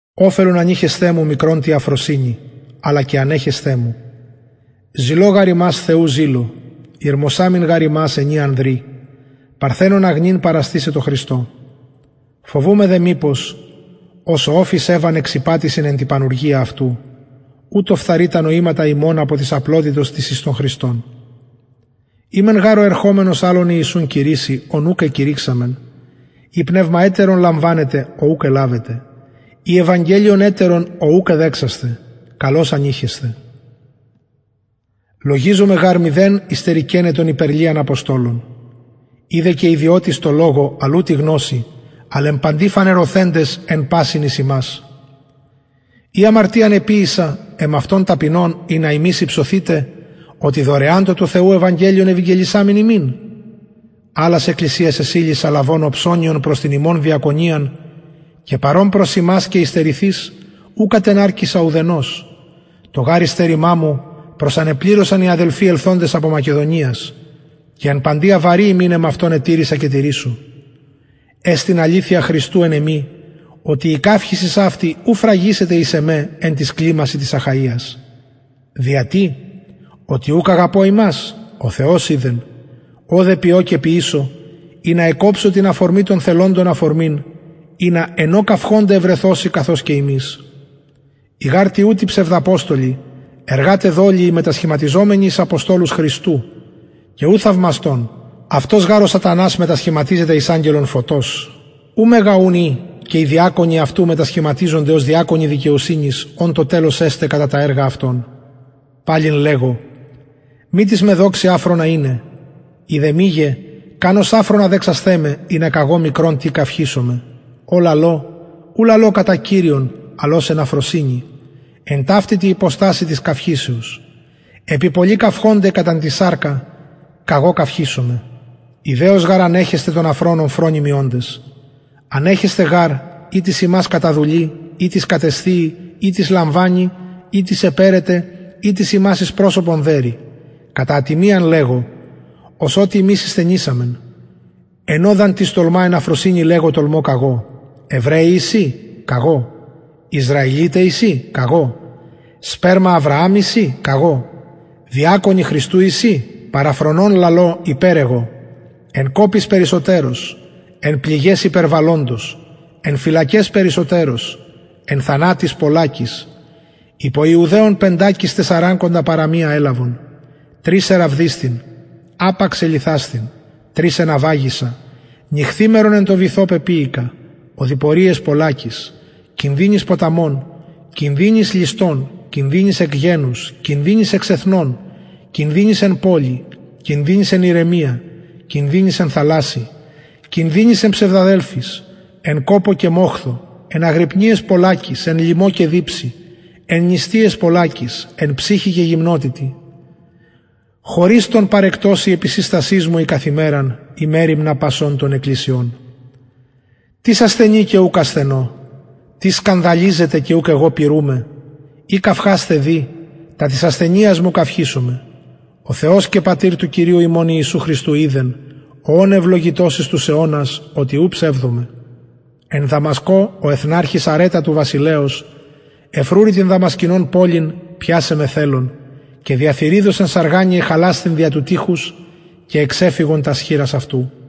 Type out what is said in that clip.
οφελον ανειχεσθε μου μικρον τη αφροσυνη αλλα και ανεχεσθε μου ζηλω γαρ υμας θεου ζηλω ηρμοσαμην γαρ υμας ενι ανδρι παρθενον αγνην παραστησαι τω χριστω φοβουμαι δε μηπως ως ο οφις ευαν εξηπατησεν εν τη πανουργια αυτου ουτως φθαρη τα νοηματα υμων απο της απλοτητος της εις τον χριστον ει μεν γαρ ο ερχομενος αλλον ιησουν κηρυσσει ον ουκ εκηρυξαμεν η πνευμα ετερον λαμβανετε ο ουκ ελαβετε η ευαγγελιον ετερον ο ουκ εδεξασθε καλως ηνειχεσθε λογιζομαι γαρ μηδεν υστερηκεναι των υπερ λιαν αποστολων ει δε και ιδιωτης τω λογω αλλ ου τη γνωσει αλλ εν παντι φανερωθεντες εν πασιν εις υμας η αμαρτιαν εποιησα εμαυτον ταπεινων ινα υμεις υψωθητε οτι δωρεαν το του θεου ευαγγελιον ευηγγελισαμην υμιν αλλας εκκλησιας εσυλησα λαβων οψωνιον προς την υμων διακονιαν και παρων προς υμας και υστερηθεις ου κατεναρκησα ουδενος το γαρ υστερημα μου προσανεπληρωσαν οι αδελφοι ελθοντες απο μακεδονιας και εν παντι αβαρη υμιν εμαυτον ετηρησα και τηρησω εστιν αληθεια χριστου εν εμοι οτι η καυχησις αυτη ου φραγησεται εις εμε εν τοις κλιμασιν της αχαιας δια τι οτι ουκ αγαπω υμας ο θεος οιδεν ο δε ποιω και ποιησω ινα εκκοψω την αφορμην των θελοντων αφορμην ινα εν ω καυχωνται ευρεθωσιν καθως και ημεις οι γαρ τοιουτοι ψευδαποστολοι εργαται δολιοι μετασχηματιζομενοι εις αποστολους χριστου και ου θαυμαστον αυτος γαρ ο σατανας μετασχηματιζεται εις αγγελον φωτος ου μεγα ουν ει και οι διακονοι αυτου μετασχηματιζονται ως διακονοι δικαιοσυνης ων το τελος εσται κατα τα εργα αυτων παλιν λεγω μη τις με δοξη αφρονα ειναι ει δε μηγε καν ως αφρονα δεξασθε με ινα καγω μικρον τι καυχησωμαι ο λαλω ου λαλω κατα κυριον αλλ ως εν αφροσυνη εν ταυτη τη υποστασει της καυχησεως επει πολλοι καυχωνται κατα την σαρκα καγω καυχησομαι ηδεως γαρ ανεχεσθε των αφρονων φρονιμοι οντες ανεχεσθε γαρ ει τις υμας καταδουλοι ει τις κατεσθιει ει τις λαμβανει ει τις επαιρεται ει τις υμας εις προσωπον δερει κατα ατιμιαν λεγω ως οτι ημεις ησθενησαμεν εν ω δ αν τις τολμα εν αφροσυνη λεγω τολμω καγω εβραιοι εισιν καγω ισραηλιται εισιν καγω σπερμα αβρααμ εισιν καγω διακονοι χριστου εισιν παραφρονων λαλω υπερ εγω εν κοποις περισσοτερως εν πληγαις υπερβαλλοντως εν φυλακαις περισσοτερως εν θανατοις πολλακις υπο ιουδαιων πεντακις τεσσαρακοντα παρα μιαν ελαβον τρις εραβδισθην απαξ ελιθασθην τρις εναυαγησα νυχθημερον εν τω βυθω πεποιηκα οδοιποριαις πολλακις κινδυνοις ποταμων κινδυνοις ληστων κινδυνοις εκ γενους κινδυνοις εξ εθνων κινδυνοις εν πολει κινδυνοις εν ερημια κινδυνοις εν θαλασση κινδυνοις εν ψευδαδελφοις εν κοπω και μοχθω εν αγρυπνιαις πολλακις εν λιμω και διψει εν νηστειαις πολλακις εν ψυχει και γυμνοτητι χωρις των παρεκτος η επισυστασις μου η καθ ημεραν η μεριμνα πασων των εκκλησιων τις ασθενει και ουκ ασθενω τις σκανδαλιζεται και ουκ εγω πυρουμαι ει καυχασθαι δει τα της ασθενειας μου καυχησομαι ο θεος και πατηρ του κυριου ιησου χριστου οιδεν ο ων ευλογητος εις τους αιωνας οτι ου ψευδομαι εν δαμασκω ο εθναρχης αρετα του βασιλεως εφρουρει την δαμασκηνων πολιν πιασαι με θελων και δια θυριδος εν σαργανη εχαλασθην δια του τειχους και εξεφυγον τας χειρας αυτου